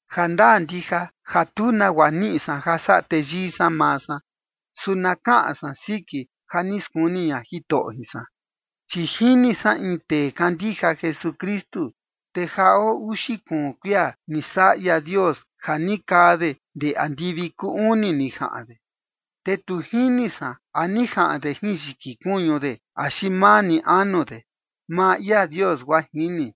Jandaa ndija ja tu nagua niꞌi san ja saꞌa teyii san maa san, su na kaꞌan san siki ja ni skuni ña Jitoꞌo jin san. Chi jini san in tee kandija Jesukristu, te ja oo uxi kuun kuia ni saꞌa ia Dios ja ni kaa de ndee andivi kuu uni ni jaꞌan de. Te tu jini san a ni jaꞌan de jin yiki kuñu de axi maa ni anu de, maa ia Dios guaa jini.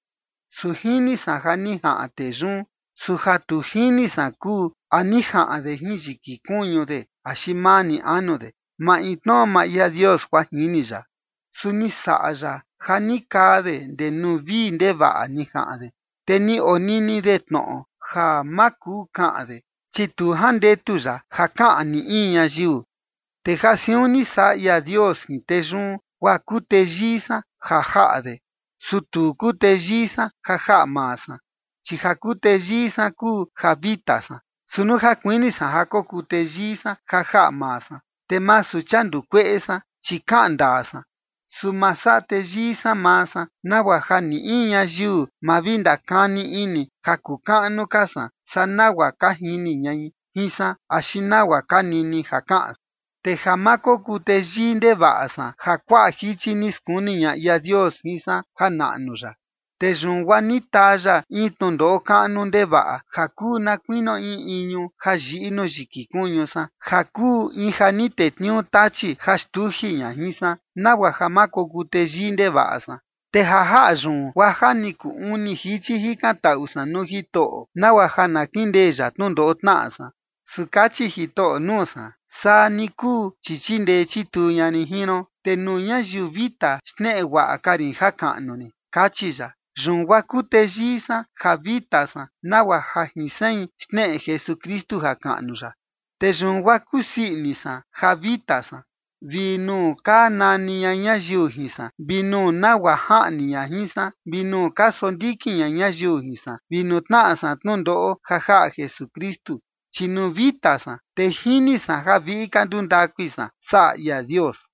Su jini san ja ni jaꞌan tee yun, su ja tu jini san kuu ja a ni jaꞌan de jin yiki kuñu de axi maa ni anu de, maintnoꞌo maa ia Dios guaa jini ya. Su ni saꞌa ya ja ni kaa de ndee nuu vii ndevaꞌa ni jaꞌan de, te ni onini de tnoꞌo ja ma kuu kaꞌan de, chi tu jandetu ya ja kaꞌan ni in ñayiu. Te ja siun ni saꞌa ia Dios jin tee yun, guaa kuu teyii san ja jaꞌa de, su tu kuu teyii san ja jaꞌa maa san, chi ja kuu teyii san kuu ja vita san. Su nuu ja kuini san ja kokuu teyii san ja jaꞌa maa san, te masu chia nduu kueꞌe san, chi kaꞌan ndaa san. Su ma saꞌa teyii san maa san, nagua ja ni in ñayiu ma vi ndakani ini ja kuu kaꞌnu ka san saa nagua ka jini ñai jin san, axi nagua ka nini ja kaꞌan san. Te ja ma kokuu teyii ndevaꞌa san ja kuaꞌa jichi ni skuni ña ia Dios jin san janaꞌnu ya. Te yun guaa ni taa ya in tnundoꞌo kaꞌnu ndevaꞌa ja kuu na kuinio in iñu ja yiꞌi nuu yiki kuñu san, ja kuu in ja ni tetniuu Tachi ja xtuji ña jin san, nagua ja ma kokuu teyii ndevaꞌa san. Te ja jaꞌa yun, guaa ja ni kuu uni jichi jikantaꞌu san nuu Jitoꞌo, nagua ja na kindee ya tnundoꞌo tnaꞌa san. Su kachi Jitoꞌo nuu san: “Saa ni kuu, chi chindee chituu ña rin jin ron, te nuu ñayiu vita xneꞌe guaꞌa ka rin jakaꞌnu rin”, kachi ya. Yun guaa kuu teyii san ja vita san nagua ja jin sein xneꞌe Jesukristu jakaꞌnu ya. Te yun guaa kusii ini san ja vita san, vi nuu ka nani ña ñayiu jin san, vi nuu nagua jaꞌni ña jin san, vi nuu ka sondikin ña ñayiu jin san, vi nuu tnaꞌa san tnundoꞌo ja jaꞌa Jesukristu. Chi nuu vita san, te jini san ja viꞌi ka nduu ndakui san saꞌa ia Dios.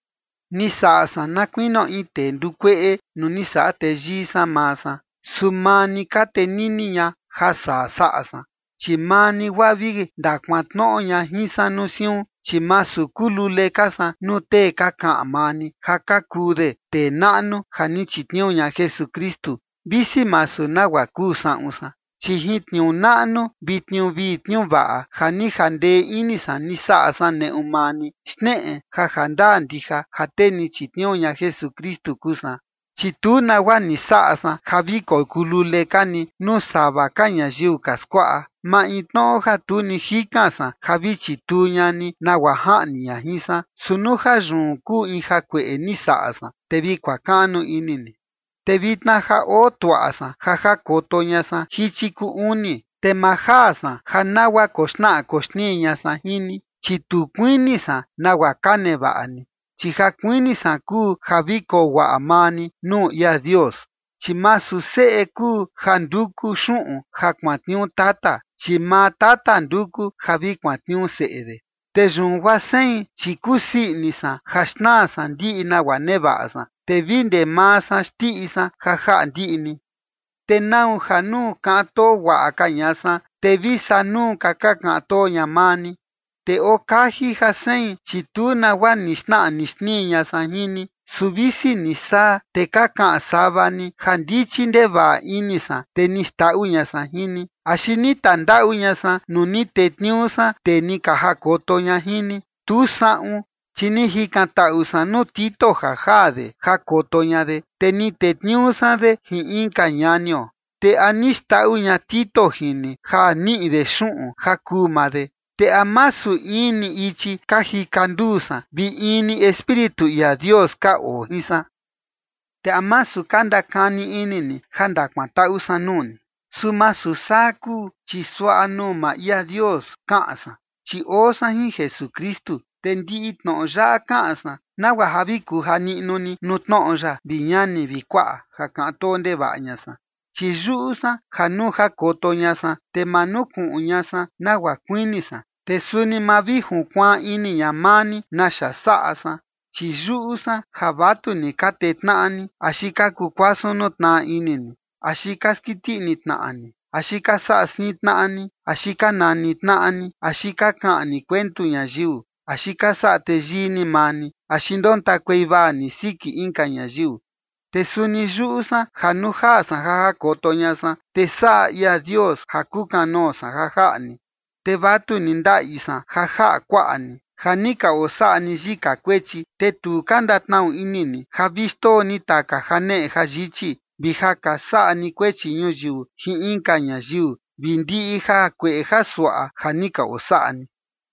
Ni saꞌa san na kuinio in tee nduu kueꞌe nuu ni saꞌa teyii san maa san, su maa ni ka tenini ña ja saa saꞌa san. Chi maa ni guaa vi ndakuantnoꞌo ña jin san nuu siun, chi masu kuu lule ka san nuu tee ka kaꞌan maa ni ja ka kuu de tee naꞌnu ja ni chitniuu ña Jesukristu, visi masu nagua kuu saꞌun san. Chi jin tniuu naꞌnu vi tniuu vii tniuu vaꞌa ja ni jandee ini san ni saꞌa san neꞌu maa ni, xneꞌe ja jandaa ndija ja tee ni chitniuu ña Jesukristu kuu san. Chi tu nagua ni saꞌa san ja vi kokuu lule ka ni nuu sava ka ñayiu ka skuaꞌa, maintnoꞌo ja tu ni jikan san ja vi chituu ña ni nagua jaꞌni ña jin san. Su nuu ja yun kuu in jakueꞌe ni saꞌa san, te vi kuakaꞌnu ini ni. Te vitna ja oo tuaꞌa san ja jakoto ña san jichi kuu uni. Te ma jaa san ja nagua koxnaꞌa koxnii ña san jin ni, chi tu kuini san nagua ka nevaꞌa ni, chi ja kuini san kuu ja vi koo guaꞌa maa ni nuu ia Dios. Chi masu seꞌe kuu ja nduku xuꞌun ja kuantniuu tata, chi maa tata nduku ja vi kuantniuu seꞌe de. Te yun guaa sein, chi kusii ini san ja xnaa san ndiꞌi nagua nevaꞌa san, te vi ndee maa san xndiꞌi san ja jaꞌa ndiꞌi ni. ¿Te nau ja nuu kaꞌan too guaꞌa ka ña san, te vi saa nuu ka ka kaꞌan too ña maa ni? Te oo kaji ja sein, chi tu nagua ni xnaꞌa ni xnii ña san jin ni. Su visi ni saa, te ka kaꞌan sava ni ja ndichi ndevaꞌa ini san, te ni xndaꞌu ña san jin ni. ¿Axi ni tandaꞌu ña san nuu ni tetniuu san tee ni ka jakoto ña jin ni? Tu saꞌun. Chi ni jikantaꞌu san nuu Tito ja jaa de jakoto ña de, te ni tetniuu san de jin inka ñanio. ¿Te a ni xndaꞌu ña Tito jin ni ja niꞌi de xuꞌun ja kuu maa de? ¿Te a masu in ni ichi ka jika nduu san vi in ni Espíritu ia Dios ka oo jin san? Te ¿a masu ka ndakani ini ni ja ndakantaꞌu san nuu ni? Su masu saa kuu, chi suaꞌa nuu maa ia Dios kaꞌan san, chi oo san jin Jesukristu. Te ndiꞌi tnoꞌo yaꞌa kaꞌan san nagua ja vi kuja niꞌnu ni nuu tnoꞌo ya, vi ñani vi kuaꞌa, ja kaꞌan too ndevaꞌa ña san. Chi yuꞌu san ja nuu jakoto ña san, te ma nukuꞌun ña san nagua kuini san, te suni ma vi junkuaan ini ña maa ni naxa saꞌa san. Chi yuꞌu san ja vatuni ka tee tnaꞌa ni, axi ka kuu kuasun nuu tnaꞌa ini ni, axi ka skiti ini tnaꞌa ni, axi ka saꞌa siin tnaꞌa ni, axi ka nani tnaꞌa ni, axi ka kaꞌan ni kuentu ñayiu, axi ka saꞌa teyii ni maa ni, axi ndontakuei vaa ni siki inka ñayiu. Te suni yuꞌu san ja nuu jaa san ja jakoto ña san, te saꞌa ia Dios ja kukanoo san ja jaꞌa ni, te vatuni ndaꞌi san ja jaꞌa kuaꞌa ni, ja ni ka osaꞌa ni yika kuechi, te tu ka ndatnaꞌu ini ni ja vi xndoo ni taka janeꞌe jayichi, vi ja ka saꞌa ni kuechi ñuyiu jin inka ñayiu, vi ndiꞌi jakueꞌe jasuaꞌa ja ni ka osaꞌa ni.